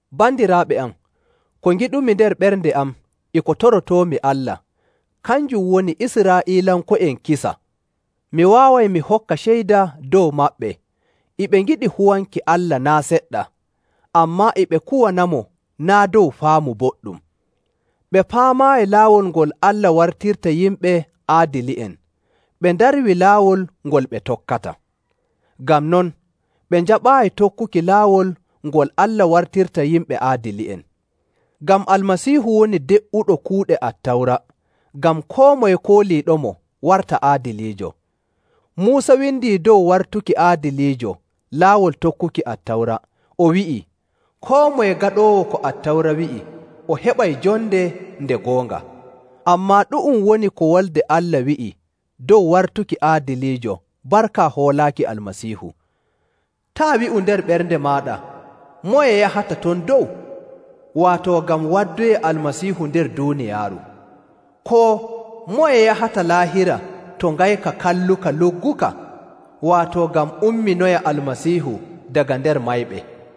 Bandiraaɓe am, ko ngiɗumi nder ɓernde am e ko torotoomi Allah, kanjum woni Israa'iilanko'en kisa. Mi waaway mi hokka ceyda dow maɓɓe e ɓe ngiɗi huwanki Allah naa' seɗɗa, ammaa e ɓe kuwanamo naa' dow faamu boɗɗum. Ɓe paamaayi laawol ngol Allah wartirta yimɓe aadili'en, ɓe ndarwii laawol ngol ɓe tokkata. Ngam non, ɓe njaɓaayi tokkuki laawol ngol Allah wartirta yimɓe aadili'en. Ngam Almasiihu woni de'uɗo kuuɗe Attawra, ngam koo moye kooliiɗomo warta aadiliijo. Muusa windii dow wartuki aadiliijo laawol tokkuki Attawra, o wi'ii, “Koo moye gaɗoowo ko Attawra wi'i o heɓay jonde nde goonga.” Ammaa ɗu'um woni ko Wolde Allah wi'i dow wartuki aadiliijo barka hoolaaki Almasiihu, “Taa' wi'u nder ɓernde maaɗa, ‘Moye yahata ton dow?’” (Waato ngam waddoya Almasiihu nder duuniyaaru), koo, “Moye yahata Laahira to ngayka kalluka lugguka?” (Waato ngam umminoya Almasiihu daga nder mayɓe).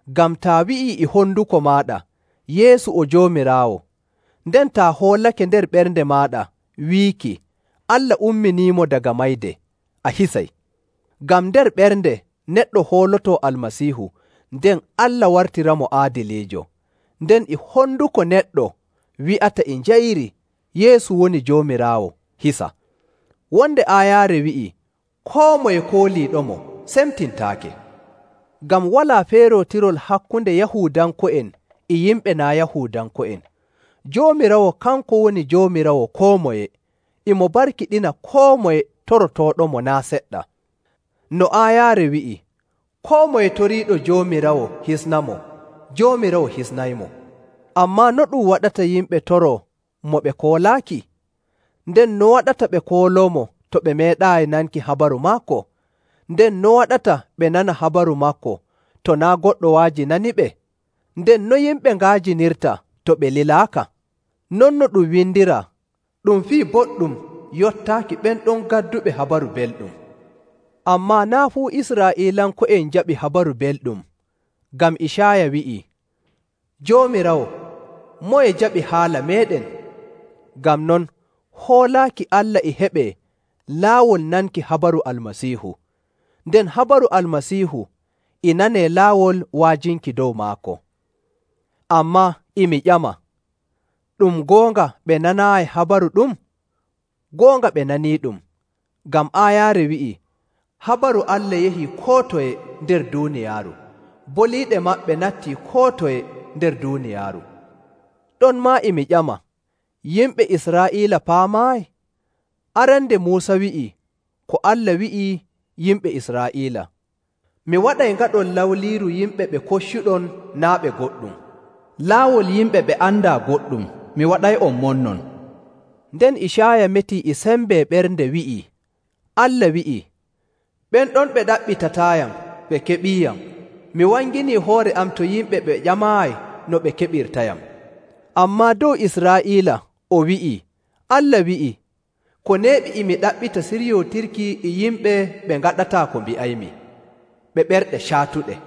Ngam taa wi'ii e honduko maaɗa, “Yeesu o Joomiraawo,” nden taa hoolake nder ɓernde maaɗa wiiki Allah umminiimo daga mayde, a hisay. Ngam nder ɓernde neɗɗo hoolotoo Almasiihu nden Allah wartiramo aadiliijo, nden e honduko neɗɗo wi'ata e njayri Yeesu woni Joomiraawo hisa. Wonde aayaare wi'ii, “Koo moye kooliiɗomo semtintaake.”. Ngam walaa feerootirol hakkunde Yahuudanko'en e yimɓe naa' Yahuudanko'en, Joomiraawo kanko woni Joomiraawo koo moye, e mo barkiɗina koo moye torotooɗomo naa' seɗɗa. No aayaare wi'i, “Koo moye toriiɗo Joomiraawo hisnamo, Joomiraawo hisnaymo.”. Ammaa no ɗum waɗata yimɓe toroo mo ɓe koolaaki? Nden no waɗata ɓe kooloomo to ɓe meeɗaayi nanki habaru maako? Nden no waɗata ɓe nana habaru maako to naa' goɗɗo wa'ajinaniɓe? Nden no yimɓe nga'ajinirta to ɓe lilaaka? Non no ɗum windiraa, “Ɗum fii boɗɗum yottaaki ɓen ɗon gadduɓe Habaru Belɗum.”. Ammaa naa' fuu Israa'iilanko'en njaɓi Habaru Belɗum; ngam Icaaya wi'i, “Joomiraawo, moye jaɓi haala meeɗen?”. Ngam non, hoolaaki Allah e heɓee laawol nanki habaru Almasiihu, nden habaru Almasiihu e nanee laawol wa'ajinki dow maako. Ammaa, e mi ƴama, ɗum goonga ɓe nanaayi habaru ɗum? Goonga ɓe naniiɗum, ngam aayaare wi'ii,. “Habaru Allah: Koo boo: “Hononde maɓɓe.” yahii koo toye nder duuniyaaru, boliiɗe maɓɓe nattii koo toye nder duuniyaaru.” Ɗonmaa e mi ƴama, yimɓe Israa'iila paamaayi? Arande Muusa wi'ii ko Allah wi'i yimɓe Israa'iila, “Mi waɗay ngaɗon lawliiru yimɓe ɓe koccuɗon naa' ɓe goɗɗum. Laawol yimɓe ɓe andaa goɗɗum, mi waɗay'on monnon.”. Nden Icaaya metii e sembe ɓernde wi'ii Allah wi'ii, “Ɓen ɗon ɓe ɗaɓɓitataayam ɓe keɓiiyam; mi wanginii hoore am to yimɓe ɓe ƴamaayi no ɓe keɓirtayam.” Ammaa dow Israa'iila o wi'i Allah wi'i, “Ko neeɓi e mi ɗaɓɓita siryootirki e yimɓe ɓe ngaɗataa ko mbi'aymi, ɓe ɓerɗe caatuɗe.”.